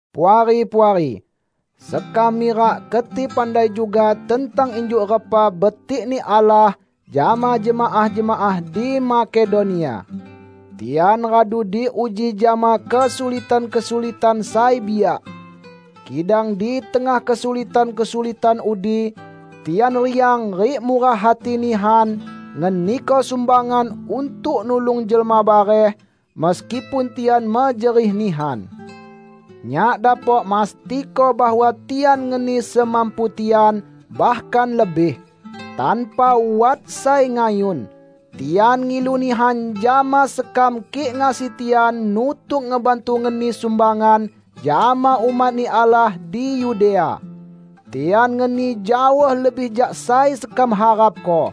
Puari-puari, sekam mirak keti pandai juga tentang injuk repa betik-Ni Allah jama jemaah-jemaah di Makedonia. Tian radu diuji jama kesulitan-kesulitan sai biak. Kidang di tengah kesulitan-kesulitan udi, tian riang rik murah hati nihan ngeniko sumbangan untuk nulung jelma bareh, meskipun tian mejerih nihan. Nyak dapok mastiko bahwa tian ngeni semampu tian, bahkan lebih. Tanpa wat sai ngayun, tian ngilu nihan jama sekam kik ngasi tian nutuk ngebantu ngeni sumbangan jama umat-Ni Allah di Yudea. Tian ngeni jaoh lebih jak sai sekam harapko.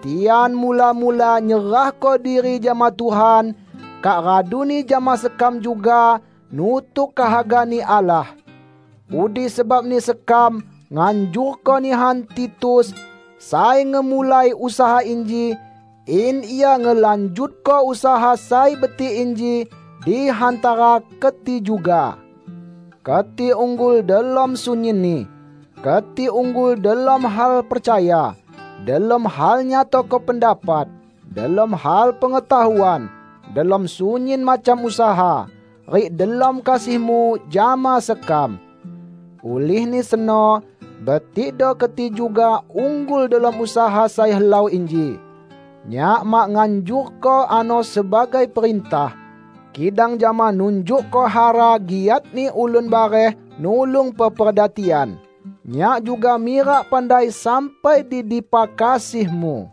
Tian mula-mula nyerahko diri jama Tuhan, kak raduni jama sekam juga, nutuk kehaga-Ni Allah. Udi sebabni sekam nganjurko nihan Titus -- sai ngemulai usaha inji -- in ia ngelanjutko usaha sai betik inji di hantara keti juga. Keti unggul delom sunyinni: Keti unggul delom hal percaya, delom hal nyatako pendapat, delom hal pengetahuan, delom sunyin macam usaha, rik delom kasihmu jama sekam. Ulihni seno, betikdo keti juga unggul delom usaha sai helau inji. Nyak mak nganjurko ano sebagai perintah. Kidang jama nunjukko hara giatni ulun bareh nulung peperda tian, nyak juga mirak pandai sampai di dipa kasihmu.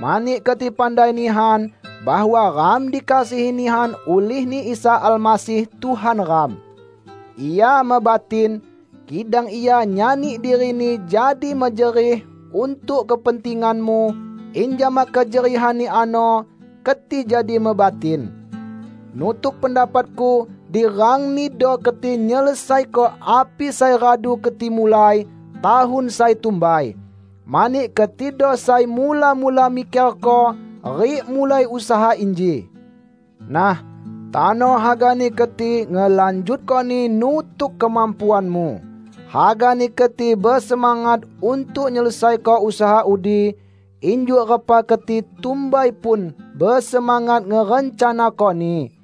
Mani keti pandai nihan bahwa ram dikasihi nihan ulih-Ni Isa Almasih Tuhan ram. Ia mebatin, kidang Ia nyani diri-Ni jadi mejerih untuk kepentinganmu, in jama kejerihan-Ni ano, keti jadi mebatin. Nutuk pendapatku, di rangnido keti nyelesaiko api sai radu keti mulai tahun sai tumbai. Mani ketido sai mula-mula mikerko rik mulai usaha inji. Nah, tano hagani keti ngelanjutkoni nutuk kemampuanmu. Hagani keti besemangat untuk nyelesaiko usaha udi, injuk repa keti tumbai pun besemangat ngerencanakoni.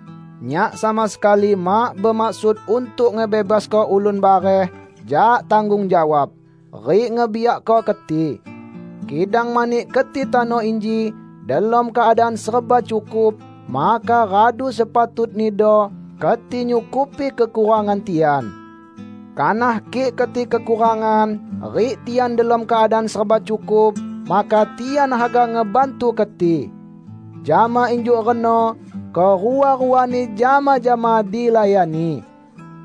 Nyak sama sekali mak bemaksud untuk ngebebasko ulun bareh jak tanggung jawab, rik ngebiakko keti. Kidang mani keti tano inji delom keadaan serba cukup, maka radu sepatutnido keti nyukupi kekurangan tian. Kanah kik keti kekurangan rik tian delom keadaan serba cukup, maka tian haga ngebantu keti. Jama injuk reno kerua-ruani jama-jama dilayani.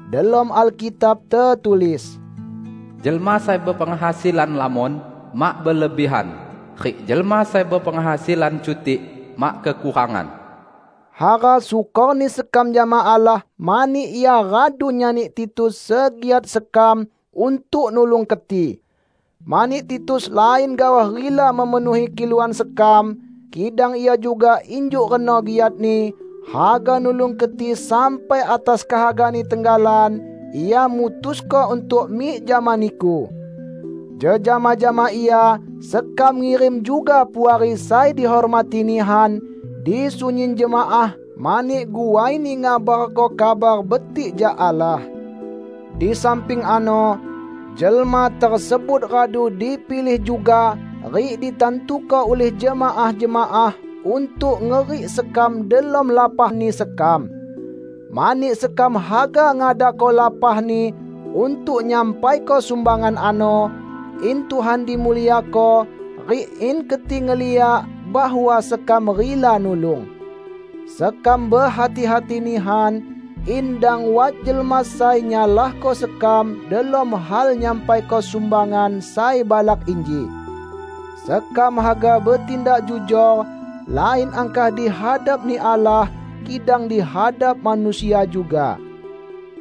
Delom Alkitab tetulis, "Jelma sai bepenghasilan lamon, mak berlebihan, rik jelma sai bepenghasilan cutik, mak kekurangan." Hara syukorni sekam jama Allah mani Ia radu nyani Titus segiat sekam untuk nulung keti! Mani Titus lain gaoh rila memenuhi kiluan sekam, kidang ia juga injuk reno giatni haga nulung keti sampai atas kehagani tenggalan ia mutusko untuk mik jama niku. Jejama jama ia sekam ngirim juga puari sai dihormati nihan di sunyin jemaah mani guaini ngabarko Kabar Betik jak Allah. Di samping ano, jelma tersebut radu dipilih juga rik ditantuko ulih jemaah-jemaah untuk ngerik sekam delom lapahni sekam. Mani sekam haga ngadako lapahni untuk nyampaiko sumbangan ano, in Tuhan dimuliako rik in keti ngeliak bahwa sekam rila nulung. Sekam behati-hati nihan in dang wat jelma sai nyalahko sekam delom hal nyampaiko sumbangan sai balak inji. Sekam haga betindak jujor lain angkah di hadap-Ni Allah, kidang di hadap manusia juga.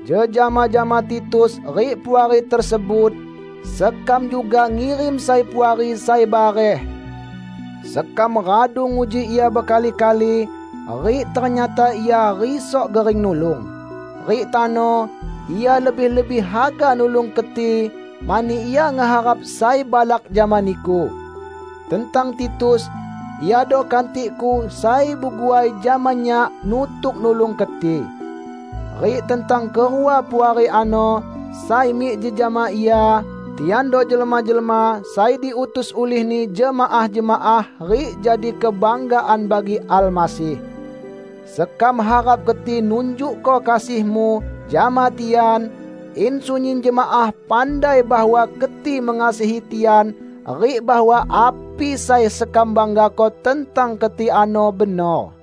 Jejama jama Titus rik puari tersebut, sekam juga ngirim sai puari sai bareh. Sekam radu nguji ia bekali-kali rik ternyata ia risok gering nulung. Rik tano, ia lebih-lebih haga nulung keti mani ia ngeharap sai balak jama niku. Tentang Titus, iado kantikku, sai beguai jama nyak nutuk nulung keti. Rik tentang kerua puari ano, sai mik jejama ia, tiando jelma-jelma sai diutus ulihni jemaah-jemaah rik jadi kebanggaan bagi Almasih. Sekam harap keti nunjukko kasihmu jama tian, in sunyin jemaah pandai bahwa keti mengasihi tian rik bahwa api sai sekam banggako tentang keti ano benor.